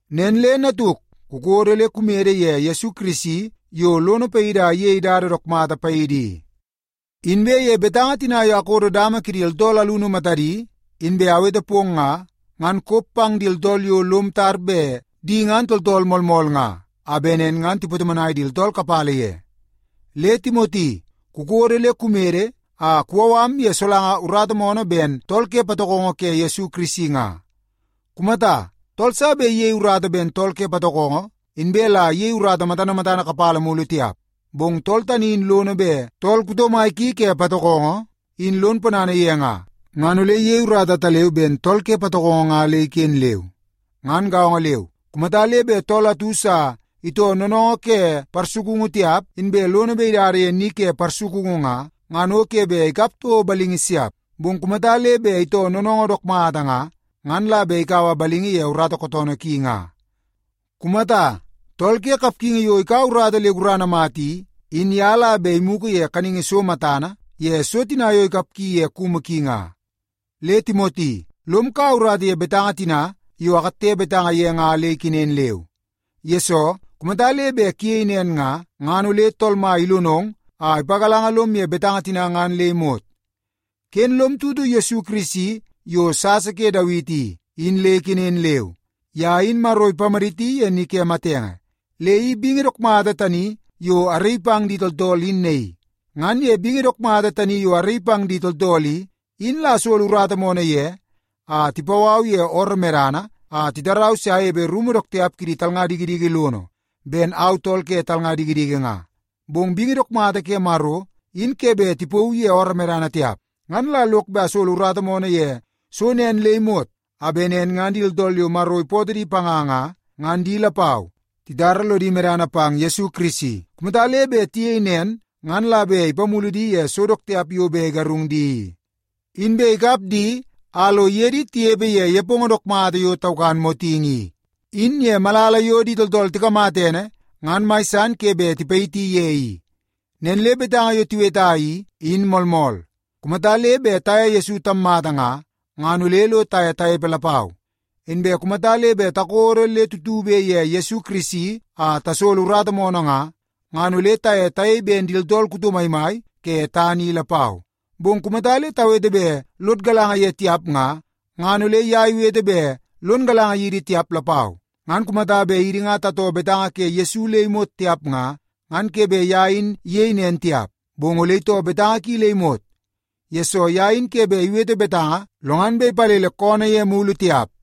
Nen le natuk, kukodo le kumede ye Yesu Kirisi yo lono paidi a iyei dada dook mata paidi i. Inbe ye betanga tina yo akodo dama kidi tooltool alunu matadi inbe awete pong nga, ngan kop pang di tooltool yo lom tar di bet di ngan tooltool moolmool nga, a bet nen ngan tipatomonai di tooltool kapala ye. Le Timoti, kukodo le kumede a kuwau am ye solanga urata moonoo ben tool ke patokongo ke Yesu Kirisi nga. Kumata, tool sa bet iyei urata ben tool ke patokongo inbe la iyei urata matana matana kapala mulu tiap. Bong tool tani in lono bet tool kuto mai ki ke patokongo in lon ponana ye nga, ngan ole iyei urata ataleu ben tool ke patokongo nga le iken leu. Ngan gaongo leu, kumata le bet tool atu sa itoo noonoongoo ke parsukungu tiap inbe lono bet idada ye ni ke parsukungu nga, ngan o ke bet ikap toko balingi siap. Bong kumata le bet itoo noonoongoo dook mata nga, ngan la bet ikaua balingi ye urata kootoonoo ki nga. Kumata, tool ke kapgingi yo ikaua urata le gurana mata i, in ye la bet imugu ye kaningi so matana ye so tina yo ikapgi ye kumu ki nga. Le Timoti, lom kaua urata ye betanga tina yo akatte betanga ye nga le ikenen leu. Yesoo, kumata le bet kuyei nen nga, ngan ole Tool Mai ilonong a ipagalanga lom ye betanga tina ngan le imot. Ken lom tutu Yesu Kirisi yo sasa ke Dawiti i, in le ikenen leu. Ye in Maro ipamaditi ye ni ke matenge, le i bingi dook mata tani yo araii pang di tooltool in naii. Ngan ye bingi dook mata tani yo araii pang di tooltool i, in la asolo urata moonoo ye a tipau au ye ooroo medana a titarau se anepe rumu dook tiap kidi talnga dikidiki lono ben au tool ke talnga dikidiki nga. Bong bingi dook mata ke Maro, in ke bet tipauu ye ooroo medana tiap. Ngan la lok bet asolo urata moonoo ye so nen le imot a bet nen ngan di tooltool yo Maro ipootoo di panga nga, ngan di lapau titara lodi medana pang Yesu Kirisi. Kumata le bet tiyei nen ngan la bet ipamulu di ye so dook tiap yo bet igarung di i, inbe ikap di a lo iye di tinepe ye nepongo dook mata yo taukan motingi i, in ye malala yo di tooltool tikamata ene ngan mai san ke bet tipayiti ye i. Nen le betanga yo tiweta i, in moolmool. Kumata le bet taye Yesu tammata nga, ngan ole lo taye tanepe lapau. Inbe kumata le bet takodo le tutube ye Yesu Kirisi a tasolo urata moonoo nga, ngan ole taye tayei ben di tooltool kuto maimai ke tana i lapau. Bong kumata le tawete bet lod galanga ye tiap nga, ngan ole ye iwete bet lon galanga yidi tiap lapau. Ngan kumata bet idi nga tatoo betanga ke Yesu le imot tiap nga, ngan ke bet ye in iyei nen tiap. Bong ole itoo betanga ki le imot, yesoo ye in ke bet iwete betanga lo ngan bet ipalele koonoo ye mulu tiap.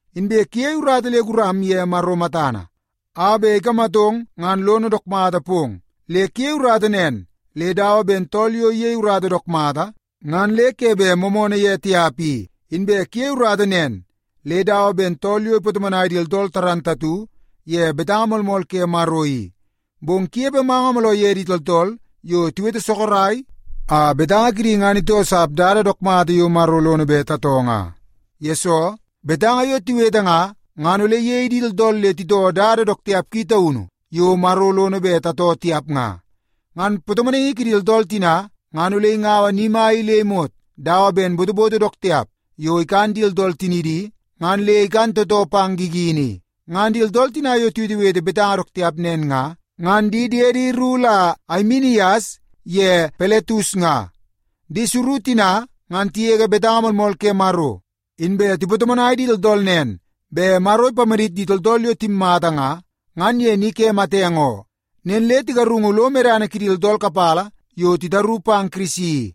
Inbe kuyei urata le guram ye Maro matana a bet ikamatong ngan lono dook mata pong. Le kuyei urata nen le dawa ben tool yo iyei urata dook mata ngan le ke bet moomoonoo ye tiap i. Inbe kuyei urata nen le dawa ben tool yo ipatomonai di tooltool dook mata ye betanga moolmool ke Maro i. Bong kunepe manga mooloo ye di tooltool yo tiwete sorok a betanga kidi ngan itoosap dada dook mata yo Maro lono bet tatoo nga. Yesoo, betanga yo tiwete nga, ngan ole iyei di tooltool le titoo dada dook tiap ki taunu yo Maro lono bet tatoo tiap nga. Ngan patomonaingi kidi tooltool tina ngan ole ingaua ni mai le imot dawa ben botoboto dook tiap yo ikan di tooltool tinidi, ngan le ikan tootoo pang gigini i. Ngan di tooltool tina yo tiwetewete betanga dook tiap nen nga, ngan di diedi ru la Aimenias ye Piletus nga. Di suru tina ngan tigege betanga moolmool ke Maro, inbe tipatomonai di tooltool nen bet Maro ipamadit di tooltool yo timmata nga, ngan ye ni ke matenge oo. Nen le tigarungu lo medana kidi tooltool kapala yo titaru pang Kirisi i.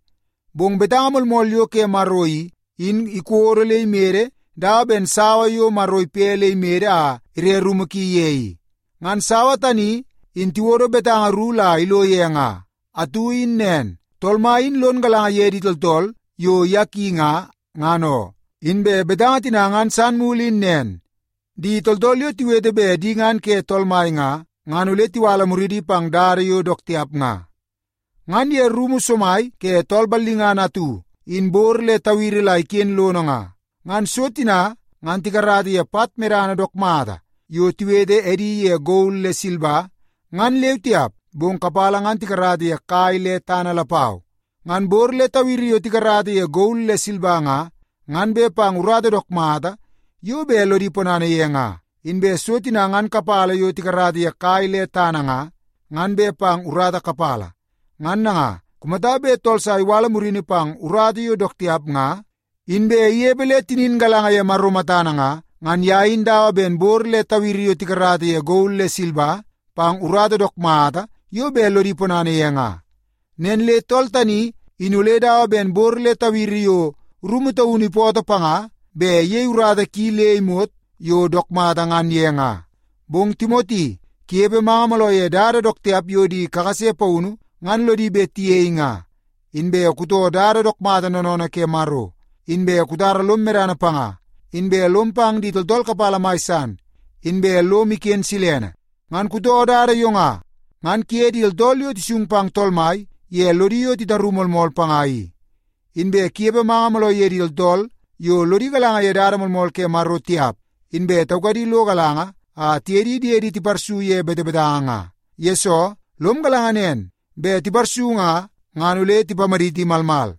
Bong betanga moolmool yo ke Maro i, in ikodo le imede dawa ben sawa yo Maro ipe le imede a ire rumu ki ye i. Ngan sawa tani in tiwodo betanga ru la ilo ye nga. Atu in nen, “Tool Mai in lon galanga ye di tooltool yo ye ki nga, ngan oo.” Inbe betanga tina ngan san mulu in nen, “Di tooltool yo tiwete bet di ngan ke Tool Mai nga, ngan ole tiwala muridi pang dada yo dook tiap nga.” Ngan ye rumu somai ke tool ballingana atu, in bor le tawiri la iken lono nga. Ngan so tina ngan tikarata ye pat medana dook mata yo tiwete edi ye gol le silba ngan leu tiap, bong kapala ngan tikarata ye kai le tana lapau. Ngan bor le tawiri yo tikarata ye gol le silba nga, ngan bet pang urata dook mata yo bet lodi ponana ye nga. Inbe so tina ngan kapala yo tikarata ye kai le tana nga, ngan bet pang urata kapala. Ngan nanga, kumata bet tool sa iwala murini pang urata yo dook tiap nga, inbe inepe le tinin galanga ye Maro matana nga, ngan ye in dawa ben bor le tawiri yo tikarata ye gol le silba pang urata dook mata yo bet lodi ponana ye nga. Nen le tool tani in ole dawa ben bor le tawiri yo rumu taunu ipootoo panga bet iyei urata ki le imot yo dook mata ngan ye nga. Bong Timoti, kunepe manga mooloo ye dada dook tiap yo di kakase paunu ngan lodi bet tiyei nga. Inbe kutoo dada dook mata noonoonoo ke Maro, inbe kutara lom medana panga, inbe lom pang di tooltool kapala mai san, inbe lom iken silene. Ngan kutoo dada yo nga, ngan kuye di tooltool yo tisung pang Tool Mai ye lodi yo titaru moolmool panga i. Inbe kunepe manga mooloo ye di tooltool yo lodi galanga ye dada moolmool ke Maro tiap inbe taukadi lo galanga a tiye di diedi tiparsu ye betebetanga nga. Yesoo, lom galanga nen bet tiparsu nga, ngan ole tipamaditi malmal.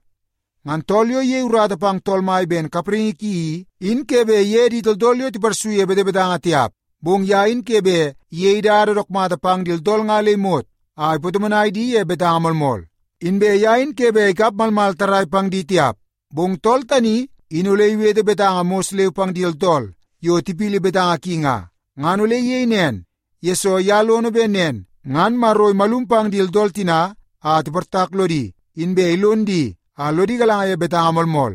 Ngan tool yo iyei urata pang Tool Mai ben kapraingi ki i, in ke bet iye di tooltool tiparsu ye betebetanga tiap. Bong ye in ke bet iyei dada dook mata pang di tooltool nga le imot a ipatomonai di ye betanga moolmool. Inbe ye in ke bet ikap malmal tarrai pang di tiap. Bong tool tani in ole iwete betanga mos leu pang di tooltool yo tipili betanga ki nga. Ngan ole iyei nen, yesoo ye lono bet nen ngan Maro imalum pang di tooltool tina a tiportak lodi, inbe ilon di a lodi galanga ye betanga moolmool.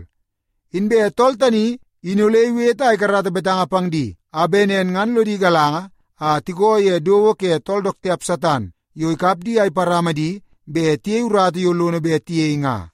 Inbe tool tani in ole iwete a ikarata betanga pang di a bet nen ngan lodi galanga a tikoo ye dowo ke tool dook tiap Satan yo ikap di a iparama di bet tiyei urata yo lono bet tiyei nga.